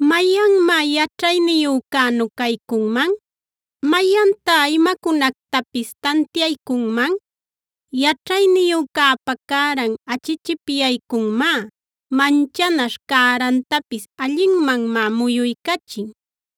¿Mayanmá yaćhayniyücänu caycunman? ¿Mayantá imacunactapis tantiaycunman? Yaćhayniyücäpa cäran achichipyaycunmá; manchanaśh cärantapis allinmanmá muyuycachin.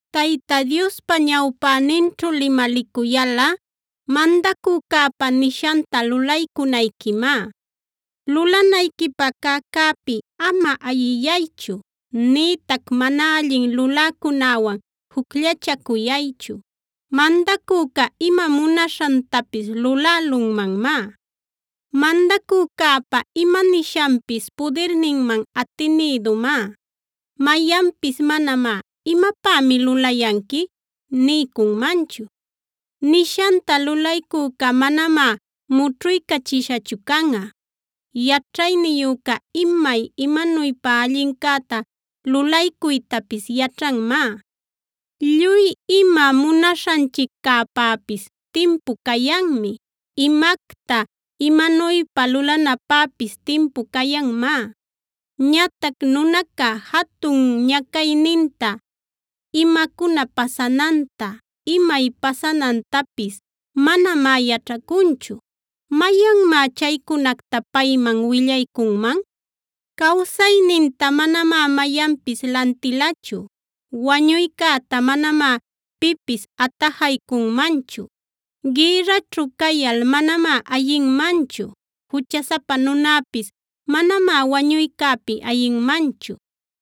Tayta Diospa ñawpäninćhu limalicuyalꞌa mandacücäpa nishanta lulaycunayquimá. Lulanayquipä cäcäpi ama ayiyaychu, nïtac mana allin luläcunäwan jucllachacuyaychu. Mandacüca ima munaśhantapis lulälunmanmá. Mandacücäpa ima nishanpis pudirninman atinïdumá. Mayanpis manamá “¿imapämi lulayanqui?” niycunmanchu. Nishanta lulaycüca manamá mućhuycachishachu canꞌa. Yaćhayniyüca imay imanuypa allincäta lulaycuytapis yaćhanmá. Lluy ima munaśhanchiccäpäpis timpu cayanmi; imacta, imanuypa lulanapäpis timpu cayanmá. Ñatac nunaca jatun ñacayninta, imacuna pasananta, imay pasanantapis manamá yaćhacunchu. ¿Mayanmá chaycunacta payman willaycunman? Cawsayninta manamá mayanpis lantilachu; wañuycäta manamá pipis atajaycunmanchu. Gïrraćhu cayal manamá ayinmanchu; juchasapa nunäpis manamá wañuycäpi ayinmanchu.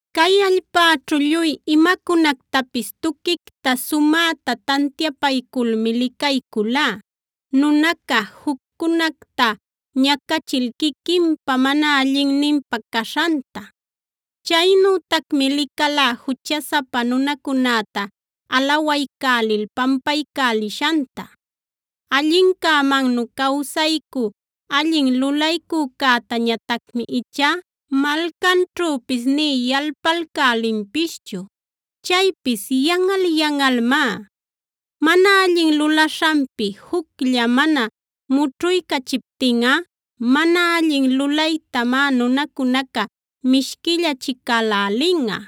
Cay allpäćhu lluy imacunactapis tuquicta sumäta tantiapayculmi licayculá, nunaca juccunacta ñacachil quiquinpä mana allinninpä caśhanta. Chaynütacmi licalá juchasapa nunacunäta alawaycälil pampaycälishanta. Allincämannu cawsaycü allin lulaycücätañatacmi ichá malcanćhüpis nï yalpalcälinpischu; chaypis yanꞌal-yanꞌalmá. Mana allin lulaśhanpi juclla mana mućhuycachiptinꞌa mana allin lulaytamá nunacunaca mishquillacälälinꞌa.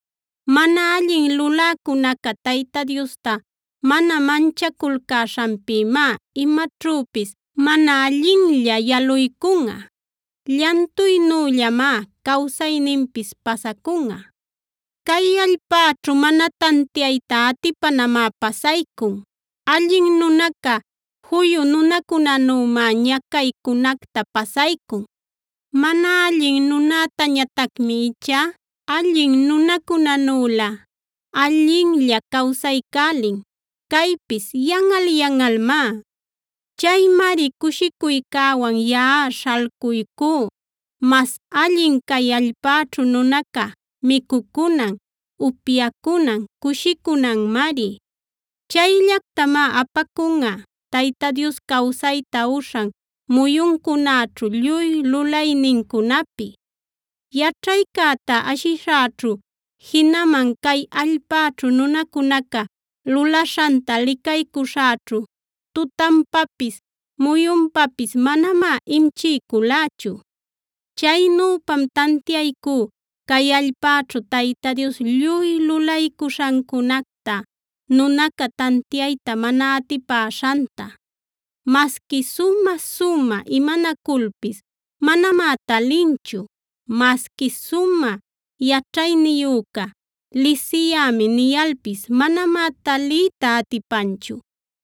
Mana allin luläcunaca Tayta Diosta mana manchaculcäśhanpïmá imaćhüpis mana allinlla yaluycunꞌa; llantuynüllamá cawsayninpis pasacunꞌa. Cay allpäćhu mana tantiayta atipanamá pasaycun; allin nunaca juyu nunacunänümá ñacaycunacta pasaycun. Mana allin nunätañatacmi ichá allin nunacunänülä allinlla cawsaycälin;a caypis yanꞌal-yanꞌalmá. Chaymari cushicuycäman yaꞌa śhalcuycú. Mas allin cay allpäćhu nunaca micucunan, upyacunan, cushicunanmari. Chayllactamá apacunꞌa Tayta Dios cawsayta uśhan muyuncunaćhu lluy lulaynincunapi. Yaćhaycäta ashishäćhu jinaman cay allpäćhu nunacunaca lulaśhanta licaycuśhäćhu tutanpapis, muyunpapis manamá imchiyculächu. Chaynüpam tantiaycú cay allpäćhu Tayta Dios lluy lulaycuśhancunacta nunaca tantiayta mana atipäśhanta. Masqui sumä-sumä imanaculpis manamá talinchu; masqui sumä yaćhayniyüca “lisiyämi” niyalpis manamá taliyta atipanchu.